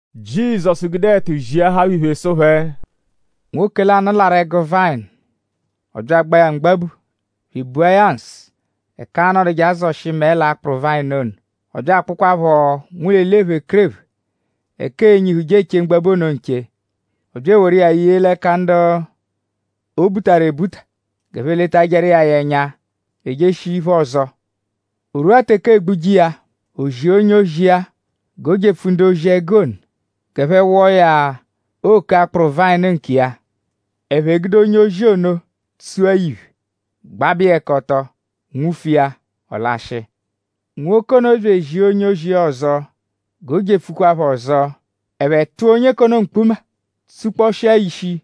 Jizọsu gude ẹtu ziahaa phẹ iphe sụ phẹ: “Nwoke lanụ larụ ẹgu vayịnu. Ọ bya agbaa ya mgbabu bya ebua ya nsụ ẹka aa-nọduje azọshi mẹe l'akpụru vayịnu ono. Ọ bya akpụkwaapho nwụlo eli ephekerephe ẹka ee-nyihuje eche mgbabu ono nche. Ọ bya eworu iya ye l'ẹka ndu o butaru g'ẹphe letajẹru iya ya ẹnya bya ejeshia-iphe ọzo. O rwua teke eegbuje iya; o zia onye-ozi iya g'o jepfu ndu-ozi-ẹgu ono g'ẹphe wọo ya òkè akpụru vayịnu nkiya. Ẹphe gude onye-ozi ono tsua ya iphe; gbabẹ iya ẹka ọto; nwufu iya; ọ lashịa. Nwoke ono bya ezia onye-ozi iya ọzo g'o jepfukwa phẹ ọzo. Ẹphe tụa onye k'ono mkpuma; tsukpọshia ya ishi;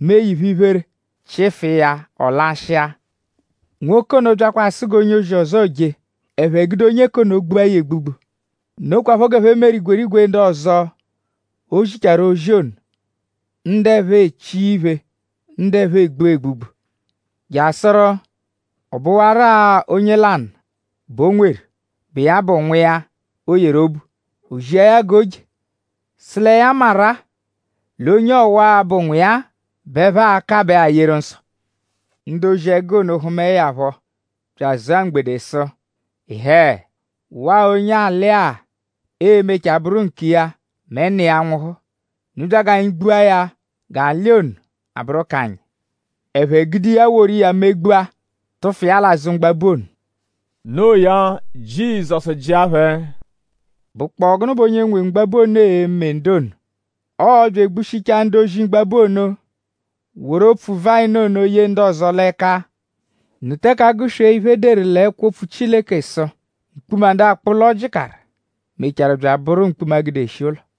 mee ya iphe-iphere; chịfu iya; ọ lashịa. Nwoke ono byakwa asụ g'onye ọzo je. Ẹphe gude onye k'ono gbua ya egbugbu. Nokwaphọ g'ẹphe meru igwerigwe ndu ọzo, o zichaaru ozi ono; ndu ẹphe echia iphe; ndu ẹphe egbua egbugbu. Jasụru ọ bụwaru-a onye lanụ bẹ o nweru, bụ iya bụ nwa iya, o yeru obu. O zia ya g'o je; sụ lẹ ya maru-a l'onye ọwa-a, bụ nwa iya-a bẹ ẹphe a-kabẹ-a yeru nsọ. Ndu ozi-ẹgu ono hụmae ya phọ bya azụa mgbede sụ: ‘Ịhee! Waa onye alị-a e-mechaa bụru nkiya mẹ nna iya nwụhu. Unu bya g'anyi gbua ya g'alị ono a-bụru k'anyi.’ Ẹphe gude iya; woru iya megbua; tụfu l'azụ mgbabu ono.” Noo ya; Jizọsu jịa phẹ: “?Bụkpoo gụnu bẹ onye nwe mgbabu ono e-me ndu ono? Ọo-bya egbushichaa ndu-ozi mgbabu ono; woru opfu-vayịnu ono ye ndu ọzo l'ẹka. ?Unu teke agụ-swee iphe, e deru l'ẹkwo-opfu Chileke sụ: “Mkpuma, ndu akpụ ụlo jịkaru; mechaarụ bya abụru mkpuma, gudeshi ụlo.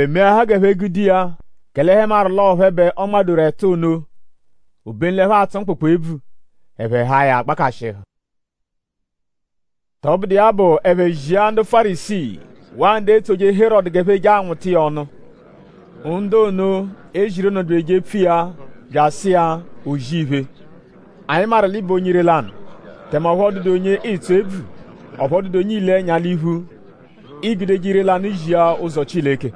“Ẹphe meahaa g'ẹphe gude iya; kẹle ẹphe maru l'ọo phẹ bẹ ọ nmadoru ẹtu ono. Obenu l'ẹphe atsụ mkpụkpu ebvu. Ẹphe haa ya gbakashịhu. “Tọbudu iya bụ; ẹphe zia ndu Fárisii; waa ndu etsoje Herọdu g'ẹphe je anwụta iya ọnu. Ndu ono, e ziru ono bya ejepfu iya bya asụ iya: O-zì-iphe; anyi maru l'ị bụ onye ire-lanụ; tẹme ọphu ọ dụdu onye ịitsu ebvu. Ọphu ọ dụdu onye iile ẹnya l'iphu. Iigudeje ire-lanụ zia ụzo Chileke.”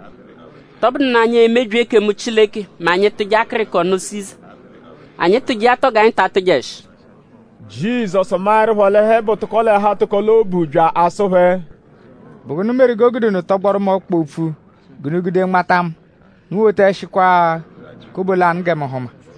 “?Tọbudu nụ anyi emebyi ekemu Chileke mẹ anyi -tụje akịriko nụ Siza? “?Anyi tụje iya tọo g'anyi ta atụjeshi?” Jizọsu maẹrupho l'ẹphe bụ tụko-l'ẹhu-atụko-l'obu bya asụ phẹ: “?Bụ gụnu meru g'o gude unu tọgboru mu ọkpa opfu g'unu gude nmata mu? Unu wotaẹshikwa kobo lanụ gẹ mu hụma.”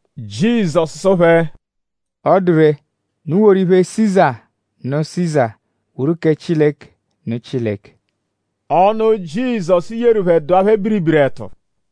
Jizọsu sụ phẹ: “Ọ dụ ree; unu woru iphe Siza nụ Siza; woru kẹ Chileke nụ Chileke.” Ọnu, Jizọsu yeru phẹ dụa phẹ biribiri ẹtu.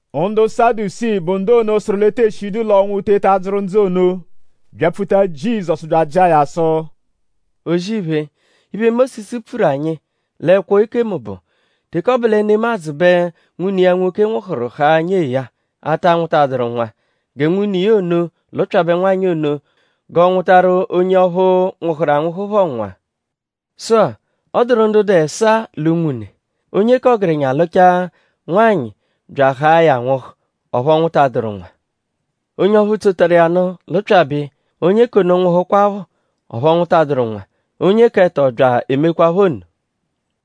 Ndu Sadusii, bụ ndu ono sụru l'e tee shidu l'ọnwu eteta adzụru ndzụ ono; byapfuta Jizọsu bya ajịa ya sụ: “O-zì-iphe; iphe, Mósisu pfuru anyi l'ẹkwo ekemu bụ: ‘Teke ọ bụ lẹ nemadzụ bẹ nwune iya nwoke nwụhuru haa nyee ya, ata nwụtaduru nwa; gẹ nwune iya ono lụpyabe nwanyị ono g'ọ nwụtaru onye ọphu, nwụhuru anwụhu phọ nwa.’ Sụ-a; ọ dụru ndu dụ ẹsaa l'unwune. Onye k'ọgerenya lụchaa nwanyị bya ahaa ya nwụhu; ọphu ọ nwụtaduru nwa. Onye ọphu tsotaru iya nụ lụpyabe iya; onye k'ono nwụhukwapho; ọphu ọ nwụtaduru nwa. Onye k'ẹto bya emekwaaphọ nno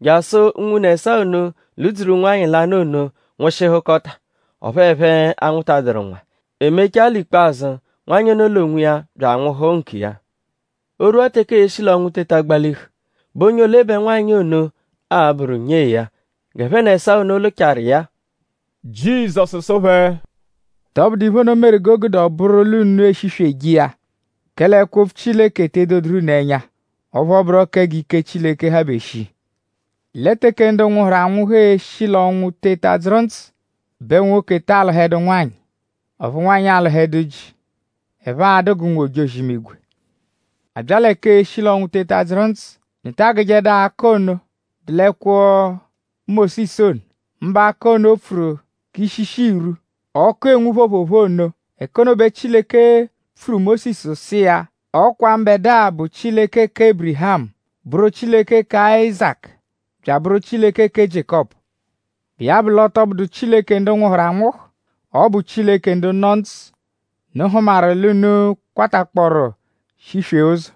jasụ unwune ẹsaa ono lụ-dzuru nwanyị lanụ ono; nwụshihukota; ọphu ẹphe anwụtaduru nwa. E mechaa l'ikpazụ; nwanyị l'onwiya bya anwụhu nkiya.” “O -rwua teke ee-shi l'ọnwu teta gbalihu;?bụ onye ole bẹ nwanyị ono a-bụru nyee ya g'ẹphe n'ẹsaa ono lụchaaru iya-a?” Jizọsu sụ phẹ: Tọbudu iphe ono meru g'o gude ọ bụru l'unu eshisweje iya; kẹle ẹkwo-opfu Chileke te edoduru unu ẹnya; ọphu ọ bụro kẹ g'ike Chileke habe shii. Lẹ teke ndu nwụhuru anwụhu e-shi l'ọnwu teta dzụru ndzụ bẹ nwoke taa lụhedu nwanyị; ọphu nwanyị alụhedu ji. Ẹphe a-dụ g'ụnwu-ojozi-imigwe. A bya lẹ k'eshi l'ọnwu teta dzụru ndzụ;?unu ta agụjedu akọ ono, dụ l'ẹkwo Mósisu ono; mbụ ẹka ono, o pfuru k'ishishi irwu, ọku enwu phoophoophoo ono? Ẹka ono bẹ Chileke pfuru Mósisu sụ iya: “Ọ kwa mbẹdua bụ Chileke kẹ Ébirihamu; bụru Chileke kẹ Áyizaku; bya abụru Chileke kẹ Jiékọpu?” Bụ iya bụ l'ọ tọ bụdu Chileke ndu nwụhuru anwụhu; ọ bụ Chileke ndu nọ ndzụ.?Unu hụmaru l'unu kwatakpọoru shiswee ụzo?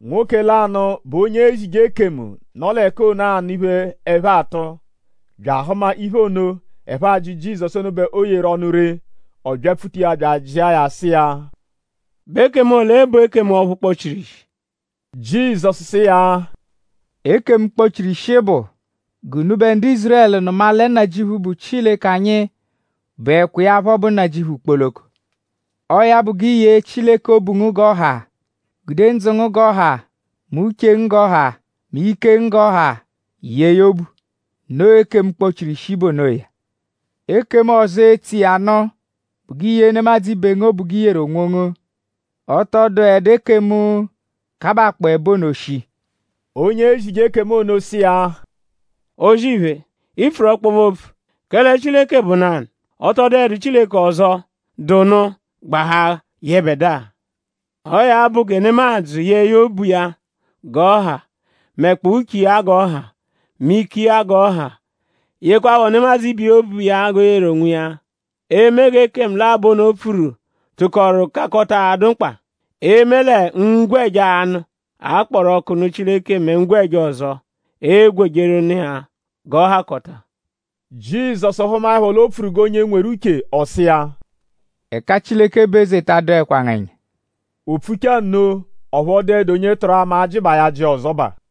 Nwoke lanụ, bụ onye ezije ekemu, nọ l'ẹka ono anụ iphe, ẹphe atụ; bya ahụma l'iphe ono, ẹphe ajị Jizọsu ono bẹ o yeru ọnu ree; ọ byapfuta iya bya ajịa ya sụ iya: “?Bụ ekemu ole bụ ekemu ọphu kpọ-chiru ishi?” Jizọsu sụ iya: “Ekemu, kpọ-chiru ishi bụ: ‘G'unubẹ ndu Ízurẹlu nụma lẹ Nnajịuphu, bụ Chileke anyi bụekwa iya phọ bụ Nnajịuphu kpoloko. Ọo ya bụ g'i yee Chileke obu ngu g'ọ ha. Gude ndzụ ngu g'ọ ha; mẹ uche ngu g'ọ ha; mẹ ike ngu g'ọ ha yee ya obu.’ Noo ekemu, kpochiru ishi bụ onoya. Ekemu ọzo, etso iya nụ bụ g'i yee nemadzụ ibe ngu obu g'i yeru onwongu. Ọ tọ dụedu ekemu, kabakpọo ẹbo ono shii.” Onye ezije ekemu ono sụ iya: “O-zì-iphe; i pfuru ọkpobe-opfu. Kẹle Chileke bụ nanụ. Ọ tọ dụedu Chileke ọzo, dụ nụ gbahaa yẹbedua. Ọo ya bụ gẹ nemadzụ yee ya obu iya g'ọ ha; mẹkpoo uche iya g'ọ ha; mẹ ike iya g'ọ ha; yekwaaphọ nemadzụ ibiya obu iya g'o yeru onwiya. Eme g'ekemu labọ ono pfuru tụkoru kakọta adụ mkpa; eme lẹ ngwẹja anụ, a kpọru ọku nụ Chileke mẹ ngwẹja ọzo, eegwejeru nụ iya g'ọ hakọta.” Jizọsu hụmaepho l'o pfuru g'onye nweru uche; ọ sụ iya: “Ẹka Chileke bụ eze ta adụekwa ngu ẹnya.” O pfuchaa nno; ọphu ọ dụedu onye tụru ama ajịbaa ya ajị ọzobaa.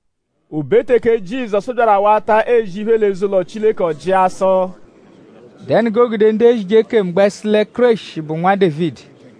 O be teke Jizọsu byaru awata ezi iphe l'eze-ụlo Chileke; ọ jịa sụ: “?Dẹnu g'o gude ndu ezije ekemu gbẹ sụ lẹ Kéreshi bụ Nwa Dévidi;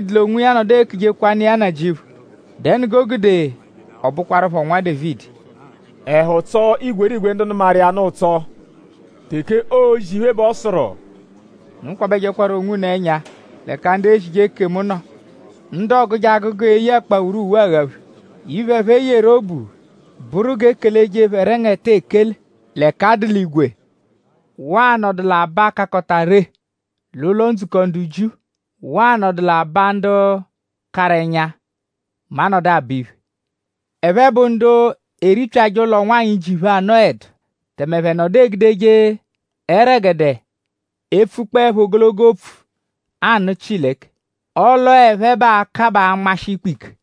Dévidi l'onwiya -nọdu ekujekwanụ iya Nnajịuphu;?dẹnu g'o gude ọ bụkwarupho Nwa Dévidi?” Ẹhu tsọo igwerigwe ndu nụmaru iya nụ ụtso. Teke oozi iphe bẹ ọ sụru: “Unu kwabẹjekwaru onwunu ẹnya l'ẹka ndu ezije ekemu nọ; ndu ọoguje agụgu eye akpawuru uwe aghaphe; iphe, ẹphe yeru obu bụru g'e keleje phẹ ẹrengete ekele l'ẹka a dụ l'igwe; waa anọdu l'aba, kakọta ree l'ụlo-ndzukọ ndu Jiu; waa anọdu l'aba ndu karụ ẹnya mẹ a -nọdu abọ iphe. Ẹphe bụ ndu eripyajẹ ụlo ụnwanyi, ji phẹ anọedu; tẹme ẹphe nọdu egudeje ẹregede epfukpọepho ogologo opfu anụ Chileke. Ọle ọo phẹ bẹ aa-kabaa anmashị ikpe ike.”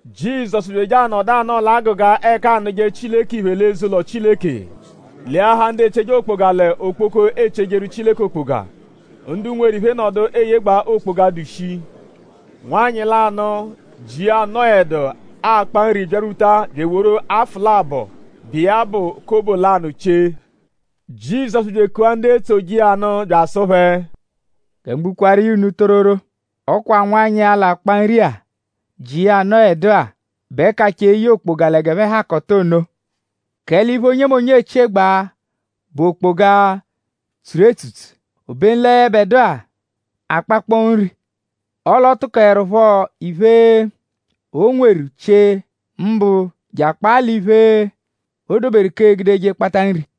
Jizọsu bya eje anọdu anọo l'agụga ẹka aanụje Chileke iphe l'eze-ụlo Chileke leahaa ndu echie okpoga l'okpoko, eechiejeru Chileke okpoga. Ndu nweru iphe nọdu eyegbaa okpoga, dụ shii. Nwanyị lanụ, ji iya anọedu, akpa nri byarwuta bya eworu afụ labọ, bụ iya bụ kobo lanụ chie. Jizọsu bya ekua ndu etsoje iya nụ bya asụ phẹ: “Gẹ mu gbukwaaru iya unu tororo; ọ kwa nwanyị-a, l'akpa nri-a, ji iya anọedu-a; bẹ kachaa eye okpoga lẹ g'ẹphe hakọta ono. Kẹle iphe, onyemonye echiegbaa bụ okpoga, tsuru etsutsu; obenu lẹ yẹbedua akpakpọo nri; ọle ọ tụkoerupho iphe, o nweru chie; mbụ je akpaa l'iphe, o doberu k'e-gudeje akpata nri.”